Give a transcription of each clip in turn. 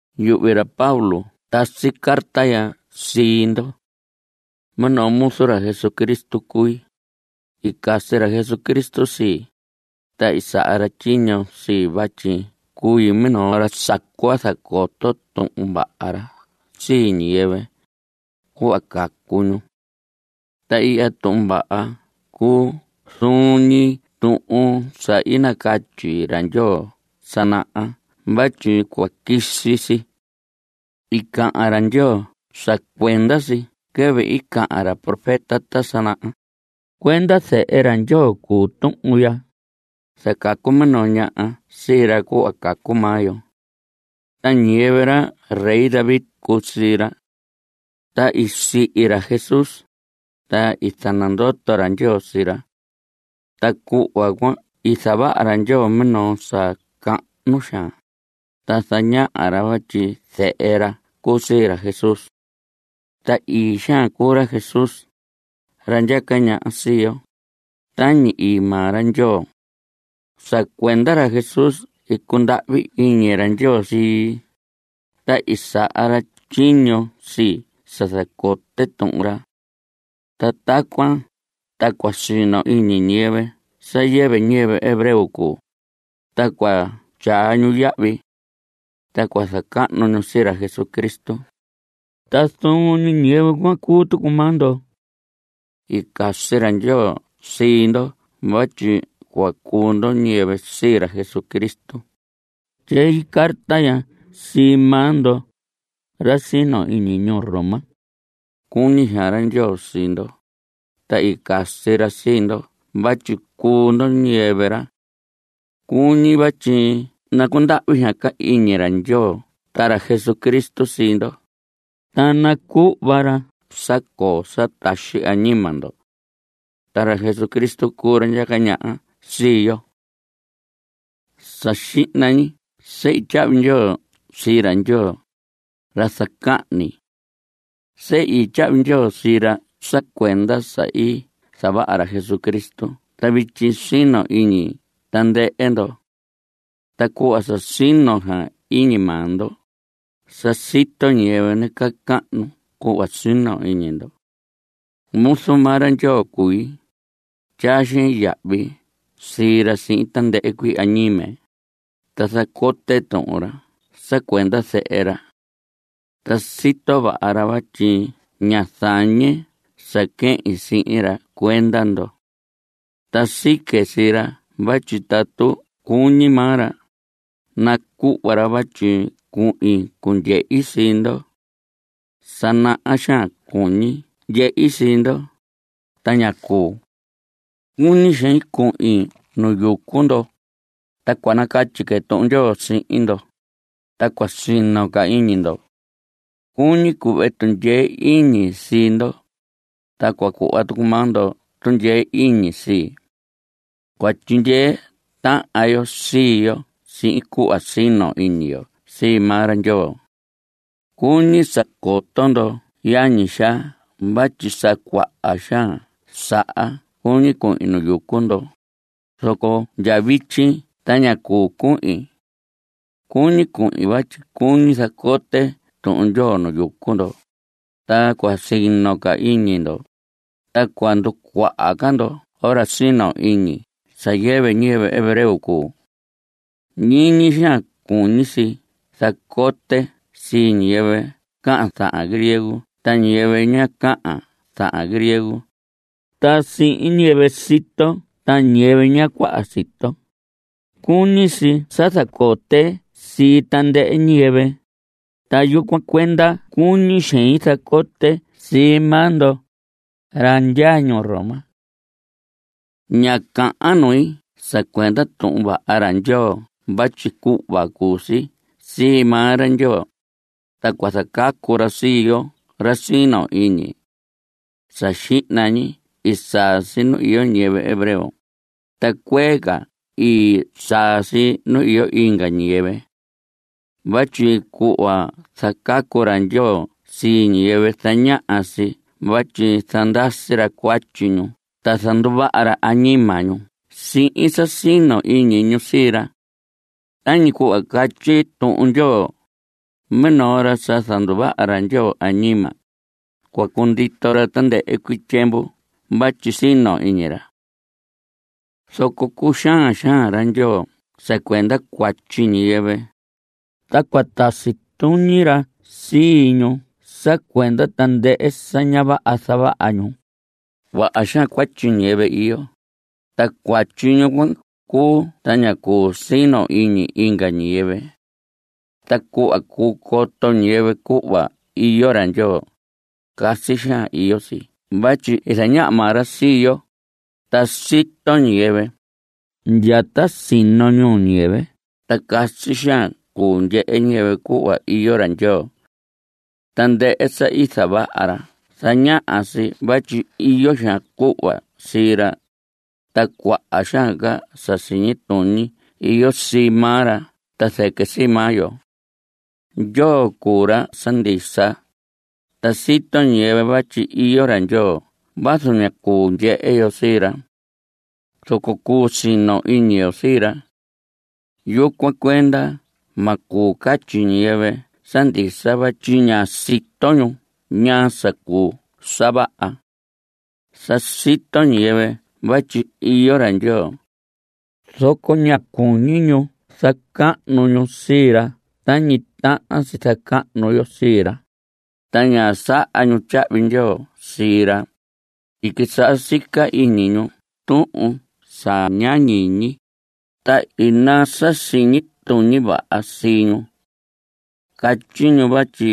Yuhvi ra Pablo tasi carta ya sii ndo. Minoo muzu ra Jesucristo cui. I casi ra Jesucristo sii, ta i saha ra tyiño sii vatyi cui minoo ra sa cua zacoto Tuhun Vaha ra sii ñiyɨvɨ, cuhva cacu ñu. Ta ihya Tuhun Vaha cuu zuun ñi tuhun sa i catyi ra Ndyoo ta sa naha vatyi cua quisi si. I cahan ra Ndyoo sa cuenda si quɨvɨ i cahan ra profeta ta sa naha. Cuenda zehe ra Ndyoo cuu tuhun ya. I zacacu minoo ñaha sii ra cuhva cacu maa yo. Ta ñiyɨvɨ ra rey David i cuu sii ra. Ta i sihi ra Jesús, ta i zanandoto ra Ndyoo sii ra. Ta cuhva cuan i zavaha ra Ndyoo minoo sa cahnu xaan, ta i zañaha ra vatyi zehe ra cuu sii ra Jesús. Ta ii xaan cuu ra Jesús, ra ndyaca ñaha sii yo, tañi ii maa ra Ndyoo. Sa cuenda ra Jesús i cundahvi iñi ra Ndyoo sii, ta i saha ra tyiño sii sa zacote Tuhun ra. Ta tacuan ta cua sino iñi ñiyɨvɨ sa yɨvɨ ñiyɨvɨ hebreo cuu, ta cua tyaa ñu yahvi. Ta cua zacahnu ñu sii ra Jesucristo. Ta zuun ñi ñiyɨvɨ cuan cuu tucu maa ndo. I casi ra Ndyoo sii ndo vatyi cuu ndo ñiyɨvɨ sii ra Jesucristo. Tyei carta ya sii maa ndo, ra sino iñi ñuu Roma. Cuñi xaan ra Ndyoo sii ndo, ta i casi ra sii ndo vatyi cuu ndo ñiyɨvɨ ra. Cuñi vatyi nacundahvi xaan ca iñi ra Ndyoo ta ra Jesucristo sii ndo, ta nacuhva ra sa coo sa taxi añima ndo. Ta ra Jesucristo, cuu ra ndyaca ñaha sii yo. Sa xihna ñi sehi tyahvi ndyoo sii ra Ndyoo, ra zacahni. Sehi tyahvi ndyoo sii ra sa cuenda sa i zavaha ra Jesucristo ta vityi sino iñi tandɨhɨ ndo. Ta cuhva sa sino xaan iñi maa ndo, sa sito ñiyɨvɨ nacahnu cuhva sino iñi ndo. Muzu maa ra Ndyoo cui. Tyaa xein yahvi sii ra sihin tandɨhɨ cuii añime, ta zacote Tuhun ra sa cuenda Zehe ra. Ta sito vaha ra vatyi ña zañe sa quehin sihin ra cuenda ndo. Ta sique sii ra vatyi tatu cuñi maa ra, nacuhva ra vatyi cuhin cundyehi sii ndo. Sa naha xaan cuñi ndyehi sii ndo, ta ñá cuu. Cuñi xein cuhin nu yucu ndo, ta cua nacatyi que Tuhun Ndyoo sihin ndo, ta cua sino ca iñi ndo. Cuñi cuhve tundyee iñi sii ndo, ta cua cuhva tucu maa ndo tundyee iñi sii. Cua tyindyee tahan yo sii yo sihin cuhva sino iñi yo sii maa ra Ndyoo. Cuñi sa coto ndo yañi xaa vatyi sa cuaha xaan saha cuñi cuhin nu yucu ndo, zoco ndya vityi ta ña cuu cuhin. Cuñi cuhin vatyi cuñi zacote Tuhun Ndyoo nu yucu ndo, ta cua sino ca iñi ndo, ta cua nducuaha ca ndoho ra sino iñi sa yɨvɨ ñiyɨvɨ hebreo cuu. Ñiñi xaan cuñi si zacote sii ñiyɨvɨ cahan zahan griego ta ñiyɨvɨ ña cahan zahan griego ta sihin ñiyɨvɨ sito ta ñiyɨvɨ ña cuaha sito. Cuñi si sa zacote sii tandɨhɨ ñiyɨvɨ, ta yucuan cuenda cuñi xein zacote sii maa ndo, ra ndyaa ñuu Roma. Ña cahan nui sa cuenda Tuhun Vaha ra Ndyoo vatyi cuhva cuu si sii maa ra Ndyoo, ta cua zacacu si sii yoo ra sino iñi. Sa xihna ñi i saa si nu iyo ñiyɨvɨ hebreo, ta cuee ca i saa si nu iyo inga ñiyɨvɨ. Vatyi cuhva zacacu ra Ndyoo sii ñiyɨvɨ zañaha si vatyi zandasi ra cuatyi ñu ta zanduvaha ra añima ñu sihin sa sino iñi ñu sii ra. Tañi cuhva catyi Tuhun Ndyoo: “Minoo ra sa zanduvaha ra Ndyoo añima, cua cundito ra tandɨhɨ cuii tyiemvu vatyi i sino iñi ra.” Zoco cuxaan xaan ra Ndyoo sa cuenda cuatyi ñiyɨvɨ, ta cua tasi tuñi ra sii ñu sa cuenda tandɨhɨ sa ña vaha zavaha ñu. Cuaha xaan cuatyi ñiyɨvɨ iyo, ta cuatyi ñu cuan cuu ta ña cuu sino iñi inga ñiyɨvɨ. Ta cuhva cuu coto ñiyɨvɨ cuhva iyo ra Ndyoo, casi xaan iyo si vatyi i zañaha maa ra sii yo, ta sa sito ñiyɨvɨ. Ndya ta sino ñuu ñiyɨvɨ ta casi xaan cuu ndyehe ñiyɨvɨ cuhva iyo ra Ndyoo. Tandɨhɨ sa i zavaha ra zañaha si vatyi iyo xaan cuhva sii ra, ta cuaha xaan ca sa siñi tuñi iyo sii maa ra ta zɨquɨ sii maa yo. Ndyoo cuu ra sa ndisa. Ta sito ñiyɨvɨ vatyi iyo ra Ndyoo vazu ña cuu ndyehe yo sii ra. Zoco cuu sino iñi yo sii ra. Yucuan cuenda ma cuu catyi ñiyɨvɨ sa ndisa vatyi ña sito ñu ñaa sa cuu sa vaha. Sa i sito ñiyɨvɨ vatyi iyo ra Ndyoo, zoco ñá cuñi ñu zacahnu ñu sii ra tañi tahan si zacahnu yo sii ra. Ta ñá saha ñu tyahvi ndyoo sii ra. I quisaha sica iñi ñu tuhun sa ña ñiñi, ta i naa sa siñi tuñi vaha sii ñu. Catyi ñu vatyi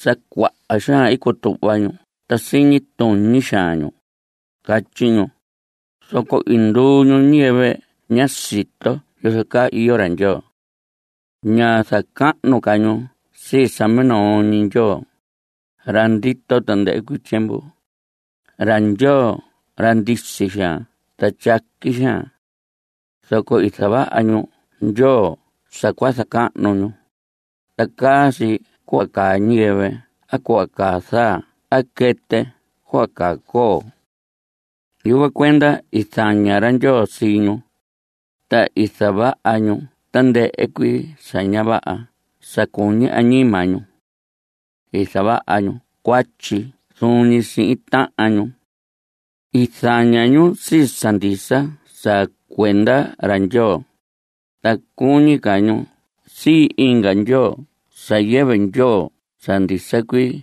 sa cuaha xaan i cutuhva ñu ta siñi tuñi xaan ñu, catyi ñu, zoco i nduu ñu ñiyɨvɨ ñá sito yozo caa iyo ra Ndyoo. Ñá zacahnu ca ñu sii sa minoo ñi Ndyoo, ra ndito tandɨhɨ cuii tyiemvu, ra Ndyoo ra ndisi xaan ta tyaqui xaan. Zoco i zavaha ñu ndyoo sa cua zacahnu ñu, ta caa si cuhva caa ñiyɨvɨ a cuhva caa zaa a quɨtɨ a cuhva caa coo. Yucuan cuenda i zaña ra Ndyoo sii ñu, ta i zavaha ñu tandɨhɨ cuii sa ña vaha sa cuñi añima ñu. I zavaha ñu cuatyi zuun ñi sihin tahan ñu. I zaña ñu sii sa ndisa sa cuenda ra Ndyoo, ta cuñi ca ñu sii inga ndyoo sa yɨvɨ Ndyoo sa ndisa cuii.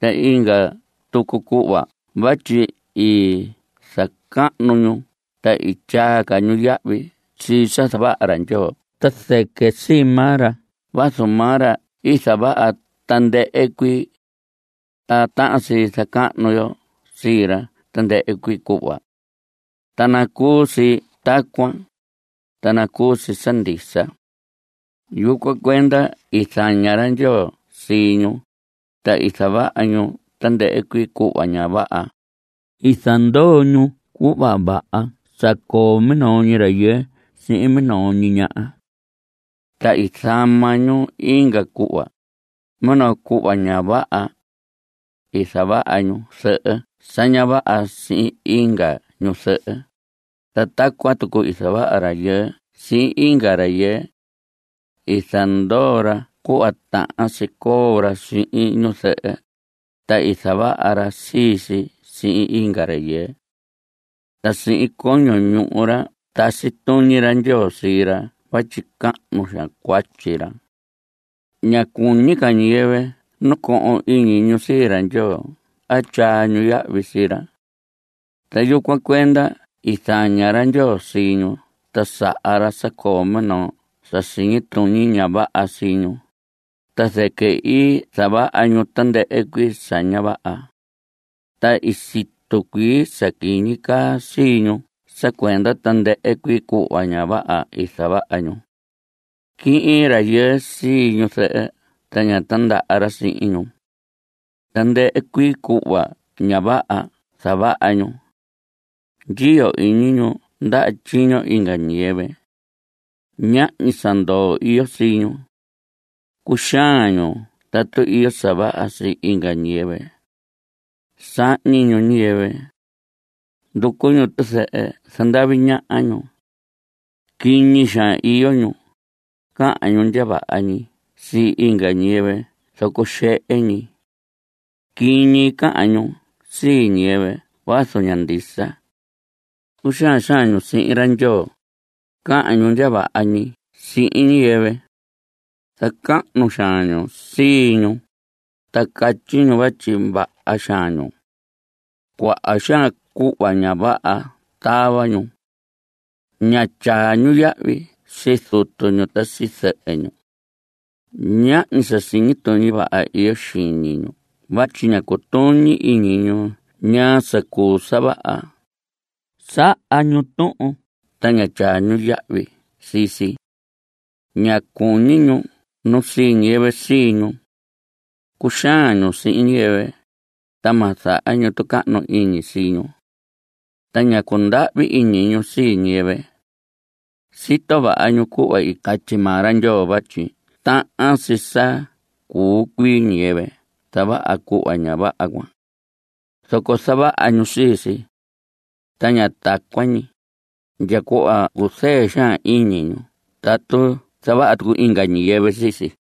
Ta inga tucu cuhva vatyi i zacahnu ñu ta i tyaa ca ñu yahvi sii sa zavaha ra Ndyoo ta zɨquɨ sii maa ra vazu maa ra i zavaha tandɨhɨ cuii. Ta tahan si zacahnu yo sii ra tandɨhɨ cuii cuhva. Ta nacuu si tacuan, ta nacuu si sa ndisa. Yucuan cuenda i zaña ra Ndyoo sii ñu, ta i zavaha ñu tandɨhɨ cuii cuhva ña vaha. I zandoo ñu cuhva vaha sa coo minoo rayɨɨ sihin minoo ñi ñaha. Ta i zama ñu inga cuhva, minoo cuhva ña vaha. I zavaha ñu zɨhɨ sa ña vaha sihin inga ñu zɨhɨ, ta tacuan tucu i zavaha rayɨɨ sihin inga rayɨɨ. I zandoo ra cuhva tahan si coo ra sihin ñu zɨhɨ, ta i zavaha ra sii si sihin inga rayɨɨ. Ta sihin coño ñuhu ra tasi tuñi ra Ndyoo sii ra vatyi cahnu xaan cuatyi ra. Ñá cuñi ca ñiyɨvɨ nacohon iñi ñu sii ra Ndyoo a tyaa ñu yahvi sii ra. Ta yucuan cuenda i zaña ra Ndyoo sii ñu ta saha ra sa coo minoo sa siñi tuñi ña vaha sii ñu, ta zɨquɨ i zavaha ñu tandɨhɨ cuii sa ña vaha. Ta i situ cuii sa quiñi caa sii ñu sa cuenda tandɨhɨ cuii cuhva ña vaha i zavaha ñu. Quihin rayɨɨ sii ñu zɨhɨ ta ña tandaha ra sihin ñu. Tandɨhɨ cuii cuhva ña vaha zavaha ñu. Ndyiyo iñi ñu ndaha tyiño inga ñiyɨvɨ. Ñahñi sa ndoo iyo sii ñu. Cuxaan ñu tatu iyo sa vaha sii inga ñiyɨvɨ. Sahñi ñu ñiyɨvɨ. Nducu ñu tizɨhɨ. Zandavi ñaha ñu. Quiñi xaan iyo ñu. Cahan ñu ndya vaha ñi sii inga ñiyɨvɨ zoco xehe ñi. Quiñi cahan ñu sii ñiyɨvɨ vazu ña ndisa. Cuxaan xaan ñu sihin ra Ndyoo. Cahan ñu ndya vaha ñi sihin ñiyɨvɨ. Zacahnu xaan ñu sii ñu, ta catyi ñu vatyi vaha xaan ñu. Cuaha xaan cuhva ña vaha tava ñu. Ña tyaa ñu yahvi sii zutu ñu ta sii zɨhɨ ñu. Ñahñi sa siñi tuñi vaha iyo xiñi ñu vatyi ña cutuñi iñi ñu ñaa sa cuu sa vaha. Saha ñu tuhun ta ña tyaa ñu yahvi sii si. Ña cuñi ñu nu sii ñiyɨvɨ sii ñu. Cuxaan ñu sihin ñiyɨvɨ, ta ma zaha ñu tucahnu iñi sii ñu. Ta ña cundahvi iñi ñu sii ñiyɨvɨ. Sito vaha ñu cuhva i catyi maa ra Ndyoo vatyi tahan si sa cuu cuii ñiyɨvɨ zavaha cuhva ña vaha cuan. Zoco zavaha ñu sii si. Ta ña tacuan ñi, ndya cuhva cuzɨɨ xaan iñi ñu tatu zavaha tucu inga ñiyɨvɨ sii si.